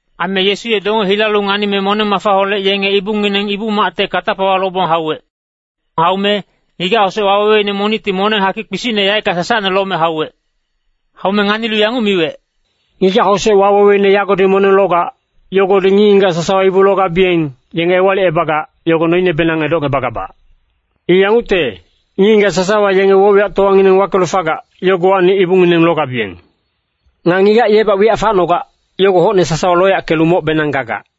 Aime Yesu ye donge hilalu nganime moneng-mafaholec yenge ibungineng Ibu-macte katapawa lobong hauwec. Haume ngigac-hosec waweweine monicti moneng hakic kpisicne sasacnehac yaeckang lome hauwec. Haume nganilu yanguc miwec, “Ngigac-hosec waweweine yagodi moneng logac, yogodi ngic-ngigac sasawa ibu logabiyeng, yenge ewalicebagac, yogo noinebenang edocngebagabac. I yangucte, ngic-ngigac sasawa yenge woc-wiyactowangineng wakelu fagac, yogowacni ibungineng logabiyeng. Nga ngigac yebac wiyac facnogac, yogo hocne sasawa loyackelu mocbenang gagac.”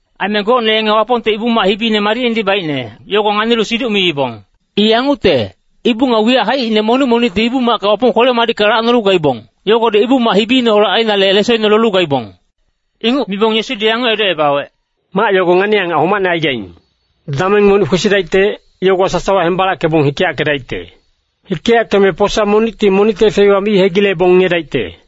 Aime gocne yenge Wapongte Ibu-mac hibine madicnedi baicne, yogo nganilu siduc miibong. I yangucte, ibu nga wiyac haicine monic monicti Ibu-macka Wapong kwele-madicka lacnolu gaibong, yogodi Ibu-mac hibineholec ainale lesoine lolu gaibong. Inguc mibong Yesudi yanguc edocebawec, “Mac yogo ngani-angac homacne aigaing. Dameng monic kwesidaicte, yogowa sasawa hembalackebong hikeyackedaicte. Hikeyackeme posa monicti monicte feiwa mi hegilebong ngiyedaicte.”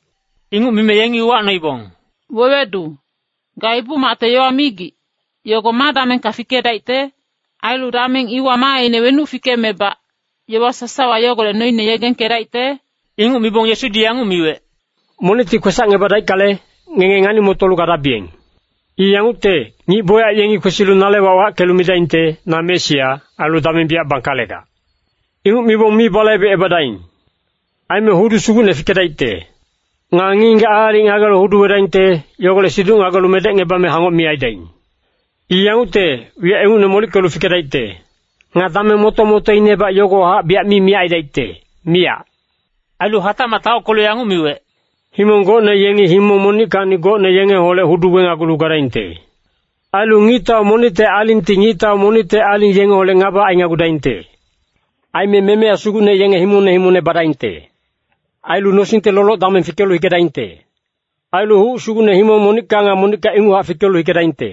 Inguc mime yengi uwacnoibong, “Wewedu, ga Ibu-macte yowa migic, yogo ma damengka fikedaicte? Ailu dameng iwa maaine wenuc fikemebac, yowa sasawa yogolec noine yegengkedaicte?” Inguc mibong Yesudi yanguc miwec, “Monicti kwesacngebadaickale, ngenge ngani-motolu gadabiyeng. I yangucte, ngic bocyac yengi kwesilu nale wac wackelu midaingte, ‘Na Mesia,’ ailu ‘Dameng biyac bangkalegac.’ Inguc mibong mi balaibecebadaing! Aime hudu sugucne fikedaicte. Nga ngic-ngigac aalic ngagelu hudu wedaingte, yogolec siduc ngagelu medecngebame hangoc mi aidaing! I yangucte, wiyac ingucne molickelu fikedaicte. Nga dameng moto-motoinebac yogowahac biyac mi miyac aidaicte, miyac.” Ailu hatacmac taockelu yanguc miwec, “Himong gocne yengi himong monickacni gocne yengeholec hudu wenagulu gadaingte. Ailu ngictau monicte alingti ngictau monicte aling yengeholec ngaba ainagudaingte. Aime memeya sugucne yenge himongne himongne badaingte. Ailu nosingte loloc-dameng fikelu hikedaingte. Ailu huc sugucne himong monicka nga monicka inguchac fikelu hikedaingte.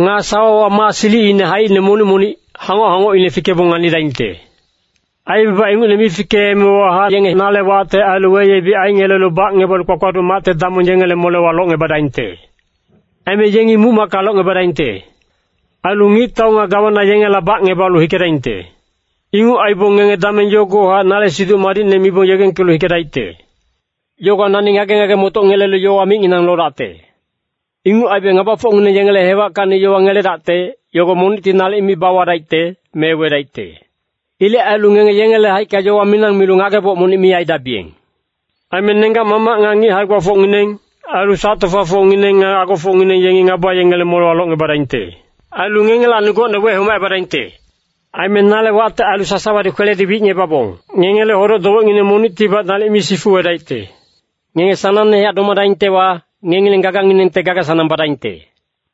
Nga sawawa maa silicine haicine monic monic, hangoc-hangocine fikebong nganidaingte. “Aibaba ingucne mi fikeemewahac yenge nale wacte ailu weyebic aingelelu bacngebalu kpakpaduc macte damong yengele molewa locngebadaingte. Aime yengi muc-macka locngebadaingte. Ailu ngictau nga gawana yengela bacngebalu hikedaingte. Inguc aibong ngenge dameng yogowahac nale Siduc Madicne mibong yegengkelu hikedaicte. Yogowa nani ngage-ngage-motoc ngelelu yowa micnginang lodacte. Inguc aibe ngabafocngineng yengele hewackacni yowa ngeledacte, yogo monicti nalic mi bawadaicte, me wedaicte. Ilec ailu ngenge yengele haicka yowa minang milu ngageboc monic mi aidabiyeng. Aime nenggac-mamac nga ngic hae-gbafocngineng, ailu sac-tofafocngineng nga agofocngineng yengi ngaba yengele molewa locngebadaingte. Ailu ngengelacni gocne wehomacebadaingte. Aime nale wacte ailu sasawadi kweledi wicngebabong ngengele hodoc-dowecngineng monictibac nalic mi sifuwedaicte. Ngenge sanangnehac domadaingtewa, ngengileng gaganginengte gaga-sanang badaingte.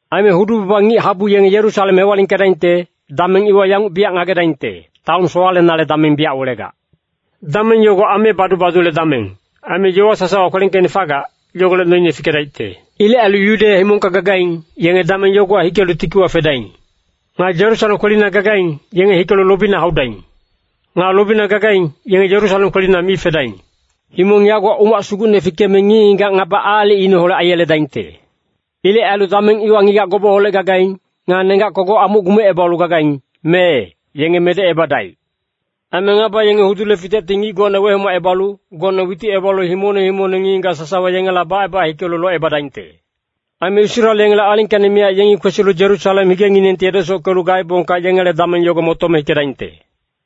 “Aime hudu-baba ngic-habu yenge Yerusalem hewalingkedaingte, dameng iwa yanguc biyac ngagedaingte, taon sowalenale dameng biyac welegac. Dameng yogo ame badu-badule dameng, aime yowa sasawa kwelengkeicne fagac, yogolec noine fikedaicte. Ilec ailu Yudeya himongka gagaing, yenge dameng yogowa hikelu tikiwa fedaing. Nga Yerusalem kwelina gagaing, yenge hikelu lobina haudaing. Nga lobina gagaing, yenge Yerusalem kwelina mi fedaing! Himong yagowa umac sugucne fikeme ngic-ngigac ngaba aalicineholec aiyeledaingte. Ilec ailu dameng iwa ngigac gobeholec gagaing, nga nenggac kogoc amuc gumecebalu gagaing, mee, yenge medecebadaic. Aime ngaba yengi hudule fitecti ngic gocne wehomacebalu, gocne witicebalu himongne himongne ngic-ngigac sasawa yengela baceba hikelu locebadaingte. Aime Israel yengele alingkacni miyac yengi kwesilu Yerusalem higenginengti edesockelu gaebongka yengele dameng yogo motome hikedaingte.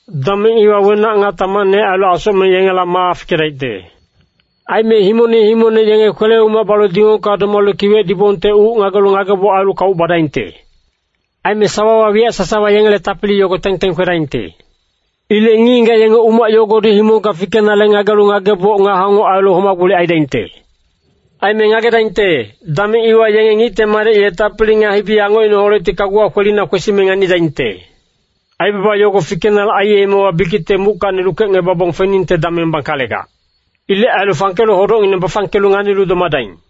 “Dameng iwa wenac nga tamacne ailu asocmeng yengela maa fikedaicte. Aime himongne himongne yenge kwele-umac balu dingongka domalu kiwec dibongte uc ngagelu ngageboc ailu kauc badaingte. Aime sawawa wiyac sasawa yengele tapili yogo teng-teng kwedaingte. Ilec ngic-ngigac yenge umac yogodi himongka fikenale ngagelu ngageboc nga hangoc ailu homa-gbolic aidaingte. Aime ngagedaingte, dameng iwa yenge Ngicte Madec ye tapili nga hibi-angocineholecti kaguwa kwelina kwesime nganidaingte. Aibaba yogo fikenale aiyemewa bikicte muckacni lukecngebabong feningte dameng bangkalegac. Ilec ailu fangkelu hodocngineng bafangkelu nganilu domadaing.”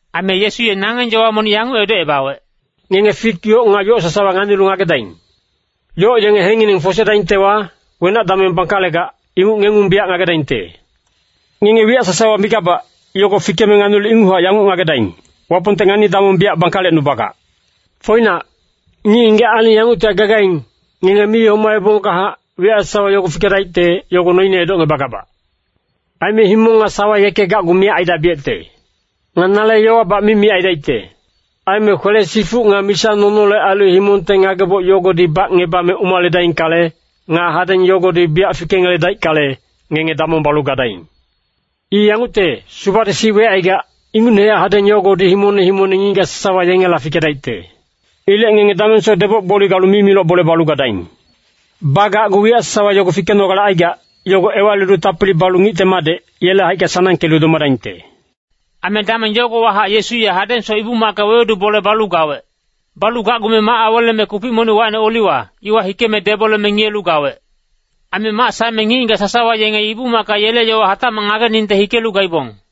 Aime Yesu ye nangeng yowa monic yanguc edocebawec, “Ngenge fik yoc nga yoc sasawa nganilu ngagedaing. Yoc yenge hekengngineng fosedaingtewa, wenac dameng bangkalegac, inguc ngengung biyac ngagedaingte! Ngenge wiyac sasawa migabac, yogo fikeme nganilu inguchac yanguc ngagedaing, Wapongte ngani-damong biyac bangkalecnubagac. “Foinac, ngic-ngigac aling yanguctihac gagaing, ngenge mi homaebongkahac, wiyac sasawa yogo fikedaicte, yogo noine edocngebagabac. Aime himong nga sawa yeke gacgu miyac aidabiyecte. Nga nale yowabac mi miyac aidaicte. “Aime kwele-sifuc nga misa-nonole ailu himongte ngageboc yogodi bacngebame umaledaingkale, nga hadeng yogodi biyac fikengeledaickale, ngenge damong balu gadaing! I yangucte, subadi sic wecaigac, ingucnehac hadeng yogodi himongne himongne ngic-ngigac sasawa yengela fikedaicte. Ilec ngenge damengsoc deboc-gboli galu mimiloc bole balu gadaing. Bagacgu wiyac sasawa yogo fikenogale aigac, yogo ewalilu tapili balu Ngicte Madec, yele haicka sanangkelu domadaingte.” Aime dameng yogowahac Yesu ye hadengsoc Ibu-macka wewedu bole balu gawec. Balu gacgume mac aweleme kupic monic wacine Oliwa, iwa hikeme deboleme ngiyelu gawec. Aime mac saeme ngic-ngigac sasawa yenge Ibu-macka yele yowa hatacmac ngageningte hikelu gaibong.